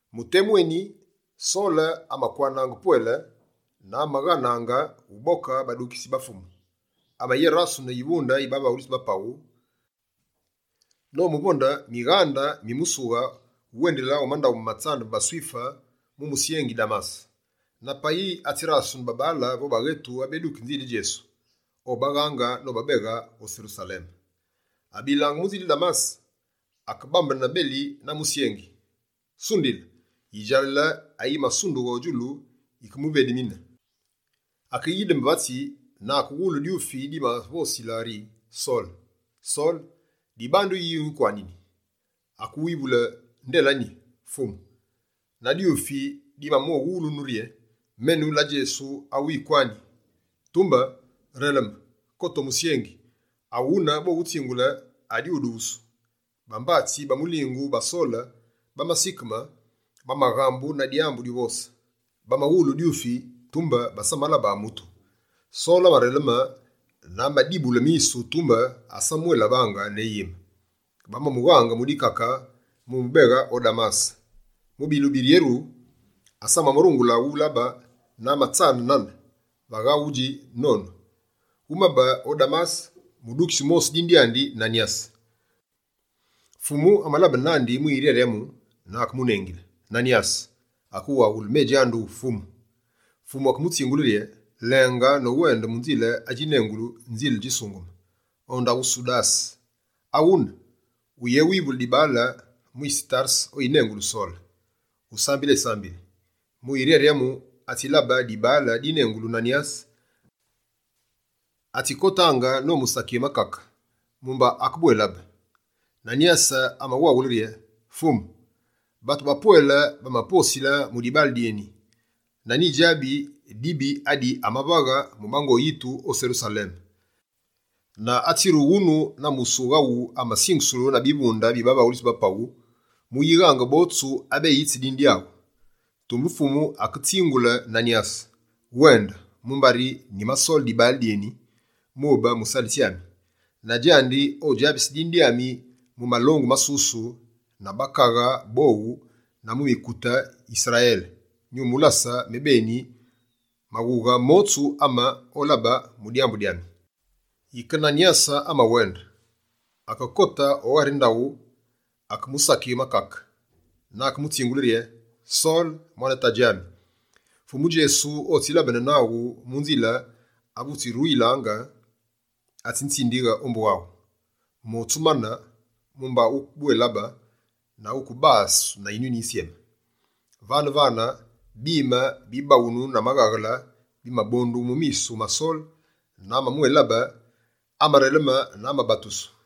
Mu temu eni, Sole amakwanaange pwele na amaghanaange uboke badukitsi ba Fumu. Amayérasene yivunde yi bavaghulitsi ba paghu, nomuvonde mighande mi musughe wuwendile o mandaghu ma tsambu ma baSwife mu musyengi Damase. Na payi atsirasene babaale vo baghetu abeduki nzile Djesu, obaghange nobabeghe o Serusaleme. Abilaange mu nzile Damase, akebambene beli na musyengi. Sundile, yidjalale yinene ayi masundughe o djulu yikemuvedemine. Akeyideme vatsi, na akewulu dyufi dimavosile rye: «Sole, Sole, dibandu yi winkwanini?» Akewivule: «Nde la nyi, Fumu?» Na dyufi dimamuwawule rye: «Menu la Djesu, awu wikwani. Tumbe releme, kote o musyengi, aghune bowutsingule adiwudusu.» Bambatsi ba mulingu ba Sole bamasikeme, bamaghambu na dyambu dyuvose. Bamawulu dyufi, tumbe basamalabe mutu. Sole amareleme na amadibule misu, tumbe asamamwélabaange ne yime. Bamamughange mu dikake mu mubeghe o Damase. Mu bilumbu biryeru, asamarungule ulabe na amatsane nane, vagha wudji nonu. Wumabe o Damase mudukitsi wumosi dine dyandi Nanyase. Fumu amalabene nandi mu yiryaryamu na akemunengile: «Nanyase!» Akewaghule: «Me djanduwu, Fumu.» Fumu akemutsingule rye: «Lenge nowende mu nzile adjinengulu “Nzile Djisungeme”, o ndaghu Sudase. Aghune, wuyéwivule dibaale, mwise Tarese oyinengulu Sole. Usambile esambili. Mu yiryaryamu, atsilabe dibaale dinengulu Nanyase, atsikotaange nomusakighe makake mumba akebwélabe.» Nanyase amawaghule rye: «Fumu, batu bapwele bamaposile mu dibaale dyeni na nyidjabi dibi adi amavaghe mu bango yitu o Serusaleme. Na atsirughe wunu na musughe awu amasingusulu na bivunde bi bavaghulitsi ba paghu, muyighange botsu abeyitsi dine dyaghu.» Tumbe Fumu aketsingule Nanyase: «Wende, mumbari nyimasole dibaale dyédine, mube musalitsi ami. Na djandi odjabise dine dyami mu malongu masusu, na bakaghe bowu, na mu mukute Yisrayele. Nyumulase mebeni maghughe motsu ame olabe mu dyambu dyami.» Yike Nanyase amawende. Akekote o ghari ndaghu, akemusakighe makake, na akemutsingule rye: «Sole, mwane tadji ami, Fumu Djesu otsilabene naghu mu nzile ave wutsiruyilaange, atsinzindighe ombu aghu. Motsu mane, mumba wukebwélabe na wukebasu na Yinyuni Yisyeme.» Vane-vane, bime bibaghunu na maghaghele bimabondughe mu misu ma Sole na amamwélabe. Amareleme na amabatusu.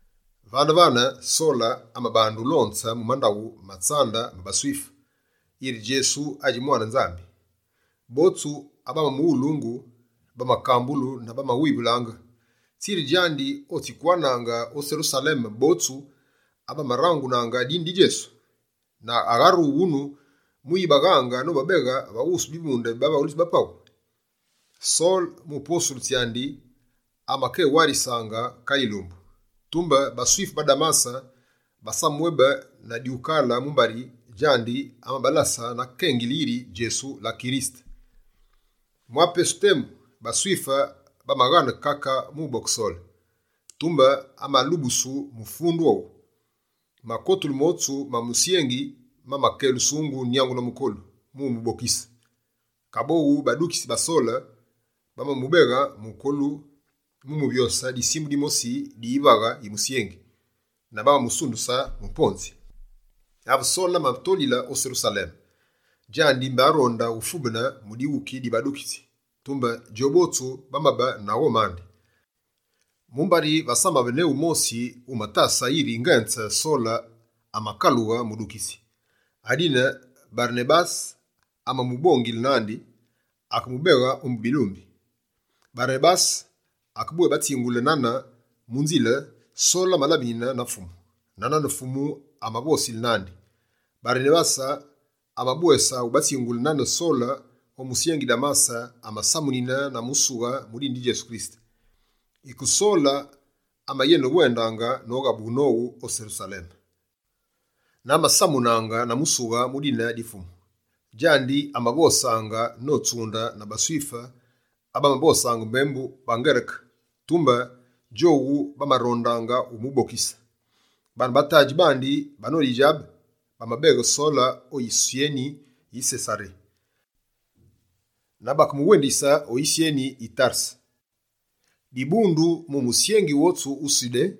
Vane-vane, Sole amabande ulonze mu mandaghu ma tsambu ma baSwife, yiri Djesu adji mwane Nzambi. Botsu abamamuwulungu bamakambulu na bamawivulaange: «Tsi djandi otsikwanaange o Serusaleme botsu abamarangunaange dine di Djesu? Na agharughe wunu mu yibaghange nobabeghe va wusu bivunde bi bavaghulitsi ba paghu?» Sole mu posulu tsyandi, amakewarisaange kale yilumbu. Tumbe baSwife ba Damase basamamwébe na dyukale mumbari djandi amabalasaange na kengili yiri Djesu la Kirisete. Mwa pesu temu, baSwife bamaghane kake muboke Sole, tumbe amalubusu mu fundu owu. Makotulu motsu ma musyengi mamakelusungu nyangu na mukolu, mu mubokise. Kaboghu badukitsi ba Sole bamamubeghe mukolu mu muvyose disimu dimosi di yivaghe yi musyengi, na bamamusunduse mu ponzi. Ave Sole amatolile o Serusaleme, djandi mbé aronde ufubene mu dighuki di badukitsi. Tumbe djobotsu bamabe na ghome andi, mumbari vasamabe ne wumosi wumatasaange yiri ngenze Sole amakalughe mudukitsi. Adine Barenabase amamubongile nandi, akemubeghe ombu bilumbi. Barenabase akebwébatsingule nane mu nzile, Sole amalabinine na Fumu, na nane Fumu amavosile nandi. Barenabase amabwese ubatsingule nane Sole o musyengi Damase, amasamunine na musighe mu dine di Djesu. Yike Sole amayenewendaange noghabughe nowu o Serusaleme, na amasamunaange na musighe mu dine di Fumu. Djandi amavosaange notsunde na baSwife abamavosaange mbembu baNgereke, tumbe djowu bamarondaange umubokise. Baane ba tadji bandi banodidjabe, bamabeghe Sole o yisyeni yi Sesaré, na bakemuwendise o yisyeni yi Tarese. Dibundu mu musyengi wotsu wu Sudé,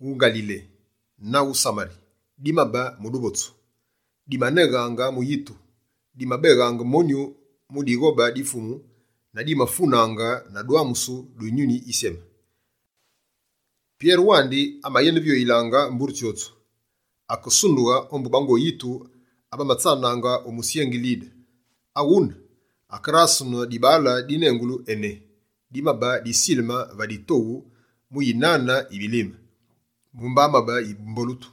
wu Ngalile na wu Samari, dimabe mu duvotsu. Dimaneghaange mu yitu, dimabéghaange monyu mu dighobe di Fumu na dimafunaange na dwamusu du Yinyuni Yisyeme. Pyere wandi, amayenevyoyilangaange mbure tsyotsu, akesundughe ombu bango yitu abamatsanaange o musyengi Lide. Aghune, akerasene dibaale dinengulu Ené dimabe disileme va ditoghu mu yinane yi bilime, mumbari amabe yimbolutu.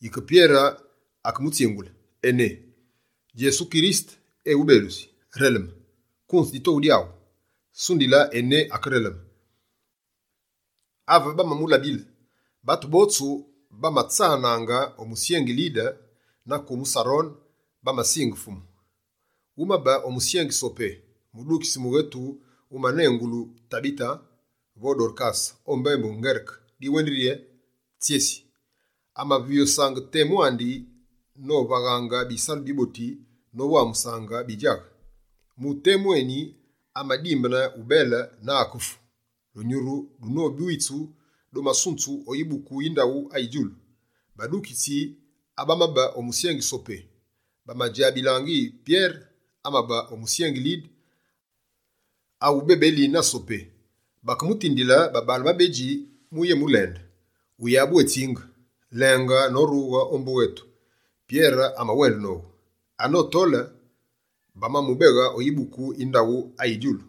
Yike Pyere akemutsingule: «Ené, Djesu Kirisete eghubelusi! Releme, kunze ditoghu dyaghu.» Sundile Ené akereleme. Ave bamamulabile, batu botsu bamatsanaange o musyengi Lide na kumu Sarone, bamasinge Fumu. Wumabe o musyengi Sopé, mudukitsi mughetu wumanengulu Tabite, vo «Dorkase» o mbembu Ngereke, diwendili bwé «Tsyesi». Amavyosaange temu andi novaghaange bisalu biboti nowamuse bidjaghe. Mu temu eni, amadimbene ubele na akefu. Dunyuru dunobwitsu, dumasunzu o yibuku yi ndaghu ayi djulu. Badukitsi abamabe o musyengi Sopé, badjabilaange yiri Pyere amabe o musyengi Lide, awuvu bébeli na Sopé, Bakemutindile babaale babedji muyémulende: «Wuyabwétsinge, lenge norughe ombu ghetu.» Pyere amawende nowu. Anotole, bamamubeghe o yibuku yi ndaghu ayi djulu.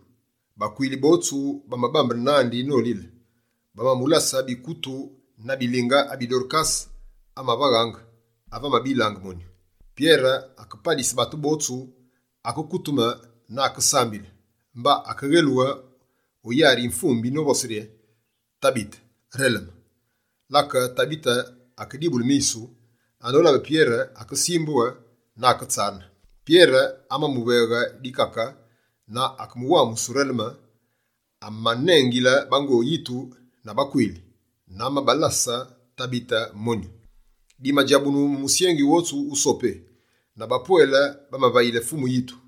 Bakwili botsu bamabambene nandi nolile. Bamamulase bikutu na bilinge, abi Dorkase amavaghaange ave amabilaange monyu. Pyere akepalise batu botsu, akekuteme na akesambile. Mba amaghelughe o yari yi mvumbi novose rye: «Tabite, releme!» Lake Tabite akedibule misu, anolabe Pyere, akesimbughe na aketsane. Pyere amamuveghe dikake na akemuwamuse ureleme. Amanengile bango yitu na bakwili, na amabalase Tabite monyu. Dimadjabunu mu musyengi wotsu wu Sopé na bapwele bamavayile Fumu yitu.